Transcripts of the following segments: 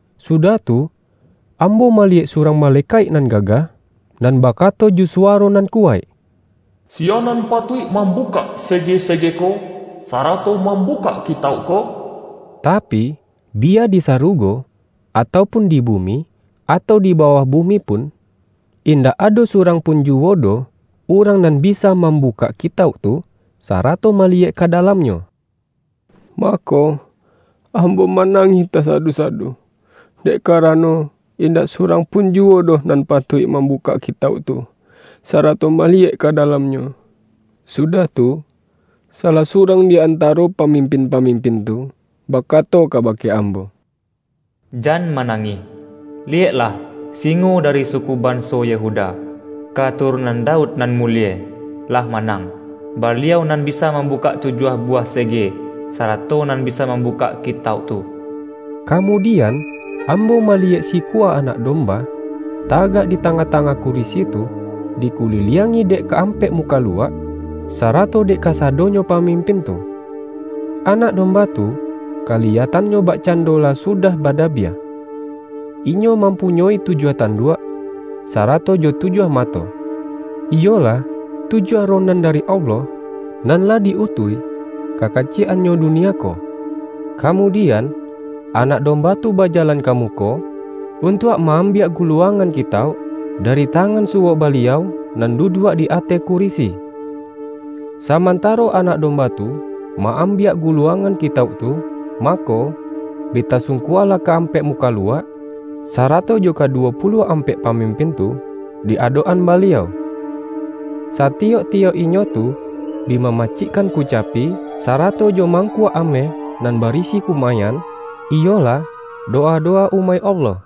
Sudah tu, ambo maliyek surang malekaik nan gagah, nan ba-kato jo suwaro nan kuwaik,”Siya nan patuik mambukak sege-sege ko, sara-to mambukak kitauk ko?” Tapi, bi-ya di sarugo, atau pun di bumi, atau di bawah bumi pun, indak ado surang pun juwo doh urang nan bisa mambu-kak kitauk tu, sarato maliyek ka da-lamnyo. Mako, ambo manangih ta-sadu-sadu, dek karano, indak surang pun juwo doh nan patuik mambukak kitauk tu, sarato maliyek ka dalam-nyo. Sudah tu, salah surang di an-taro pamimpin-pamimpin tu, bakato kabake ambo,”Jan manangih! Liyek-lah! Singo dari suku banso Yehuda, katurunan Daud nan mulie, lah ma-nang. Baliau nan bisa mambukak tujuah buwah sege, sarato nan bisa mambukak kitauk tu.” Kamudian, ambo maliyek sikua Anak Domba, tagak di tangah-tangah kurisi tu, di kuliliangi dek ka-ampek mukaluak, sarato dek kasado-nyo pamimpin tu. Anak Domba tu, kaliyatannyo bakcando lah sudah ba-dabiah. Inyo mampunyoi tujuah tan-duak, sarato jo tujuah mato: iyolah, tujuah Roh nan dari Allah, nan lah di-utuih ka kaciyek-annyo dunia ko. Kamudian, Anak Domba tu bajalan ka muko, untuak ma-ambiak guluang-an kitauk, dari tangan suwok Baliau nan duduak di ateh kurisi. Saman-taro Anak Domba tu ma-ambiak gu-luangan kitauk tu, mako, bi tasung-kualah ka-ampek mukaluak, sarato jo kaduwo puluah ampek pamim-pin tu di adok-an Baliau. Satiyok-ti-yok inyo tu, bi mamacikkan kucapi, sarato jo mangkuak ameh nan barisi kumayan, iyolah, dowa-dowa umaik Allah.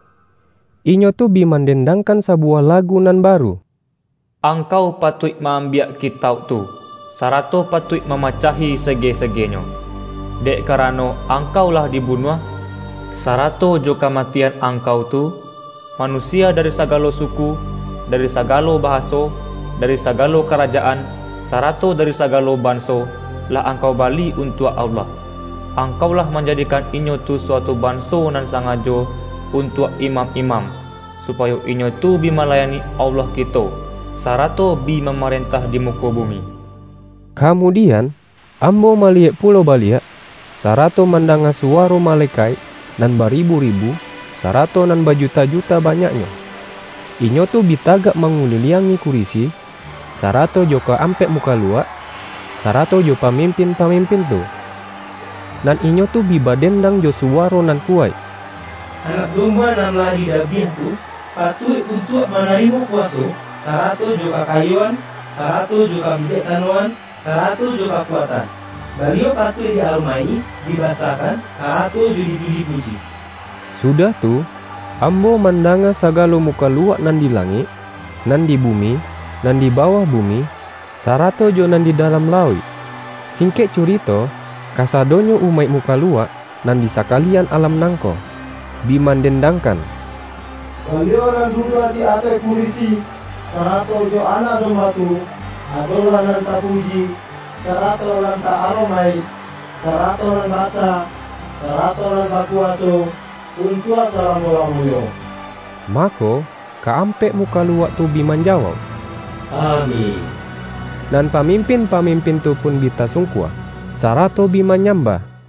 Inyo tu bi mandendangkan sa-buwah lagu nan baru:”Angkau patuik maambiak kitauk tu, sarato patuik mamacahi sege-segenyo. Dek karano, Angkau lah dibunuah, sarato jo kamatian Angkau tu, manusia dari sagalo suku, dari sagalo bahaso, dari sagalo karajaan, sarato dari sagalo banso, lah Angkau bali untuak Allah. Angkau lah manjadikan inyo tu suatu banso nan sangajo untuak imam-imam, supayo inyo tu bi malayani Allah kito, sarato bi mamarentah di muko bumi.” Kamudian, ambo maliyek pulo baliak, sarato mandanga suwaro ma-lekaik nan baribu-ribu, sarato nan ba-juta-juta banyaknyo. Inyo tu bi tagak manguliliangi kurisi, sarato jo ka-ampek mukaluak, sarato jo pamimpin-pamimpin tu. Nan inyo tu bi baden-dang jo suwaro nan kuwaik,”Anak Domba nan lah didabiah tu, patuik untuak manarimo kuwaso, sarato jo kakayoan, sarato jo kabijaksanoan, sarato jo kakuatan; Baliau patuik di-aromaik-i, dibasakan, sarato jo dipuji-puji!” Sudah tu, ambo mandanga sagalo mukaluak nan di langik, nan di bumi, nan di bawah bumi, sarato jo nan di dalam lauik ---- singkek curito, kasado-nyo umaik mukaluak nan di sakalian alam nangko ---- bi mandendangkan,”Baliau nan duduak di ateh kurisi, sarato jo Anak Domba tu, adolah nan tapuji, sarato nan ta-aromaik, sarato nan basa, sarato nan bakuwaso untuak salamo-lamonyo!” Mako, ka-ampek mukaluak tu bi manjawauk,”Amin!” Nan pamimpin-pamimpin tu pun bi tasungkua, sarato bi manyambah.